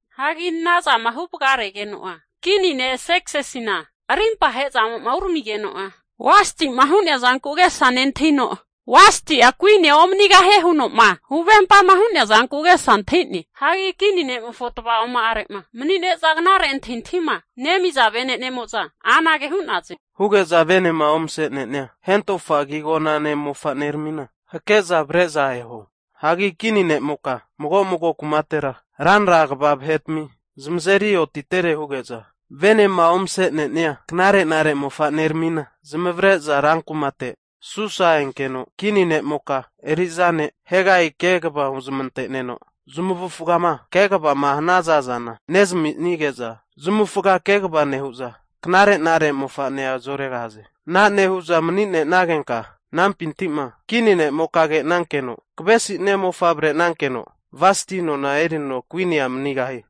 Hagi ana zama huvagaregeno'a kini ne' Serksisina arimpa ahe'zamo'ma uramigeno'a, Vasti'ma hu'nea zanku agesa nentahino, Vasti'a kuinia omanigahie huno'ma huvempama hu'nea zanku agesa antahi'ne. Hagi kini ne'mofo tava'oma'are'ma mani'ne'za knare antahintahima nemiza vene'nemo'za anage hu'naze, huge'za venema ovase'ne'nia hentofa agi agonane mofa'nerami hake'za avre'za eho hu'za hu'naze. Hagi kini ne'moka mago mago kumatera ranra kva vahetami zamazeri otitere huge'za venema omasenenia knarenare mofaneramina zamavare'za rankumate Susa enkeno, kini ne'moka eri'za ne' Hegai kegava huzmante'neno zamavufagama eri so'ema hanaza zana nezaminige'za zamavufaga eri so'e nehu'za knare'nare mofa'nea zoregahaze. Ana nehu'za mani'nenagenka anampinti'ma kini ne'moka kenankeno kavesi'nia mofa avrenankeno Vasti nona erino kuinia manigahie.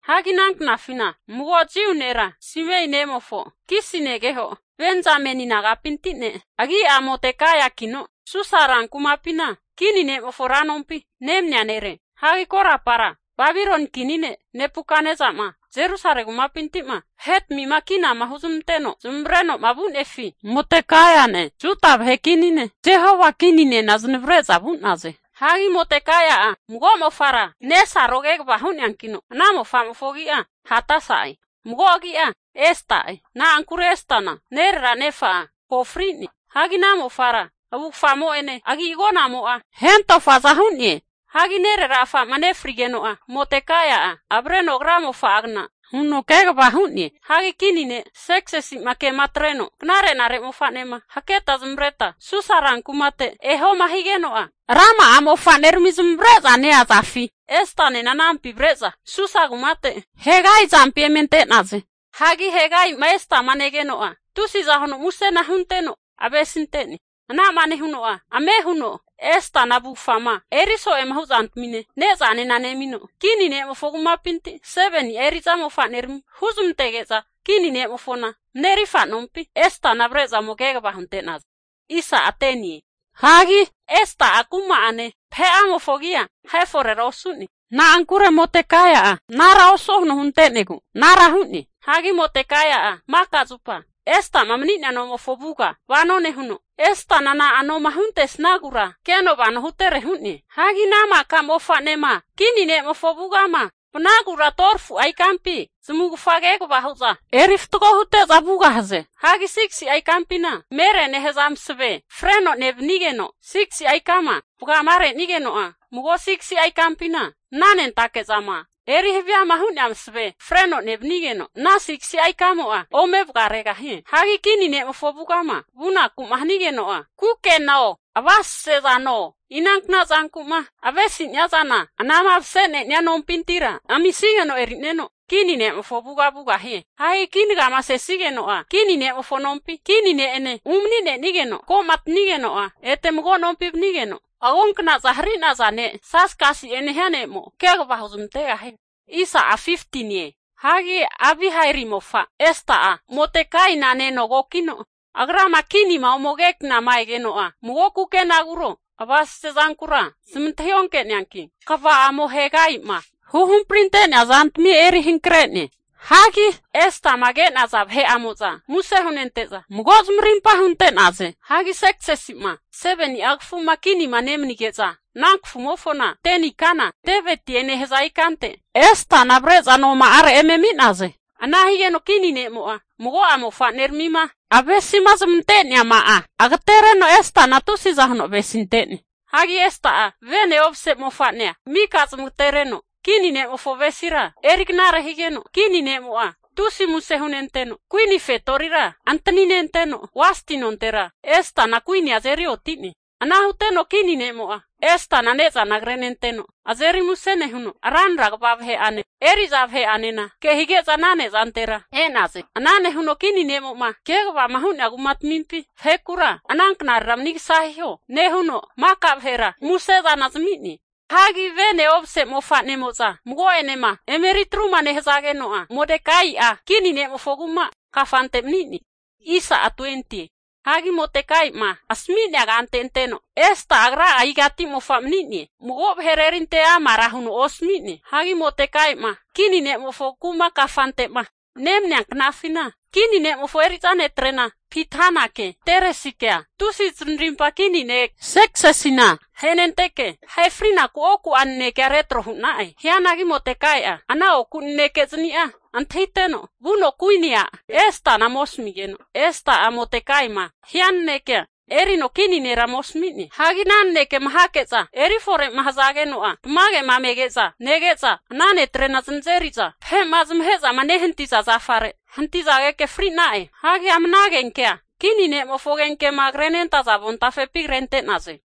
Hagi ananknafina mago Jiu nera Simei nemofo Kisi negeho Benzameni nagapinti ne' agi'a Modekaiakino Susa rankumapina kini ne'mofo ra nompi nemania nere. Hagi korapara Babiloni kini ne' Nebukatnesama Jerusalemi kumapinti'ma vahe'tmima kinama huzmanteno zamavare'noma vu'nefi, Modekaiane Juda vahe kini ne' Jehoiakininena zanavre'za vu'naze. Hagi Modekaia'a mago mofara nesaro kegava hu'neankino, ana mofamofo agi'a Hadasha'e, mago agi'a Esta'e. Na'ankure Estana nerera nefa'a ko fri'ne. Hagi ana mofara avufgamo'ene agi'agonamo'a hentofaza hu'ne. Hagi nerera afa'ma nefrigeno'a, Modekai'a avreno agra mofa'agna huno kegava hu'ne. Hagi kini ne' Serksisima kema atreno, knare'nare mofa'nema haketa zamavareta Susa rankumate ehoma higeno'a, rama'a mofa'nerami zamavare'za neazafi Estanena anampi avre'za Susa kumate Hegai azampi eme ante'naze. Hagi Hegai'ma Estama negeno'a, tusiza huno musena hunteno avesinte'ne. Ana'ma nehuno'a, ame huno Estana avufgama eri so'ema hu zantamine ne'zanena nemino, kini ne'mofo kumapinti 7ni'a eri'za mofanerami huzmantege'za kini ne'mofona marerirfa nompi Estana avre'za ome kegava hunte'naze. Hagi Esta'a kuma'ane vahe'amofo agia ahe forera osu'ne, na'ankure Modekaia'a anara osuo huno hunte'negu anara hu'ne. Hagi Modekaia'a maka zupa Esta'ma mani'nea nomofo avuga vano nehuno, Estana na'anoma huntesnagura keno vano hutere hu'ne. Hagi ana maka mofa'nema kini ne'mofo avugama vanagura 12fu'a ikampi zamavufaga kegava hu'za erifatgo hute'za vugahaze. Hagi 6'a ikampina mere nehaza masave freno nevnigeno 6si'a ikama vagamare'nigeno'a, mago 6si'a ikampina mnanentake zama eri haviama hu'nea masave freno nevnigeno ana 6si'a ikamo'a ome vagaregahie. Hagi kini ne'mofo avugama vunaku'ma hanigeno'a, kukeno avasesezano inankna zanku'ma avesi'nia zana anama mase'nenia nompintira amisageno eri'neno kini ne'mofo avuga vugahie. Hagi kinagama sesigeno'a, kini ne'mofo nompi kini ne'ene umani'nenigeno komatanigeno'a, ete mago nompi vanigeno agonknaza hari'naza ne' Sasgasi'e nehia ne'mo kegava huzmantegahie. Hagi Abihaili mofa Esta'a Modekaina nenogokino agrama kini ne'ma ome ke knama egeno'a, mago kukenaguro avasase zankura zamantahi onke'neanki kva'amo Hegai'ma huhamprinte'nea zantami eri hankre'ne. Hagi Estama ke'naza vahe'amo'za muse hunente'za mago zamarimpa hunte'naze. Hagi Serksisima 7ni'a kafuma kinima nemanige'za ana kafumofona, 10ni ikana Tebetie nehaza ikante Estana avre'za noma'are eme ami'naze. Ana higeno kini ne'mo'a mago'a mofa'neramima avesizmante'neama'a agatereno Estana tusiza huno avesinte'ne. Hagi Esta'a vene omase mofa'nea mika zamagatereno kini ne'mofo avesira eri knare higeno, kini ne'mo'a tusi muse hunenteno kuini fetorira antaninteno, Vasti nontera Estana kuinia azeri oti'ne. Ana huteno kini ne'mo'a Estana ne'za krenenteno azeri musena nehuno, ranra kva vahe'ane eri'za vahe'anena kehige'za ana ne'zantera e'naze. Ana nehuno kini ne'mo'ma kegavama hu'nea kumatamimpi vahekura ananknarera manigasa hiho nehuno maka vahera musezana zami'ne. Hagi vene omase mofa'nemo'za mago'enema emeri atruma nehazageno'a, Modekai'a kini ne'mofo kuma kafante mani'ne. Hagi Modekai'ma asami'nea kante anteno Esta'a agra igati mofa mani'ne mago vahera erinte amara huno osami'ne. Hagi Modekai'ma kini ne'mofo kuma kafante'ma nemania knafina, kini ne'mofo eri'za netrena Bithanake Teresikea tusi zanarimpa kini ne' Serkisisina ahenenteke ahe frinaku oku'a nanekea retro hu'na'e. Hianagi Modekaia'a ana oku nanekezni'a antahiteno, vuno kuini a' Estana ome asamigeno Esta'a Modekai'ma hia nanekea erino kini nera ome asami'ne. Hagi ana nanekema hake'za erifore'ma hazageno'ma tamagema me'nege'za nege'za, ana netrena zanazeri'za vahe'ma zamahe'zama nehanti'za zafare hantizageke fri'na'e. Hagi ama ana agenkea kini vahe'mofo agenkema krenentaza avontafepi krente'naze.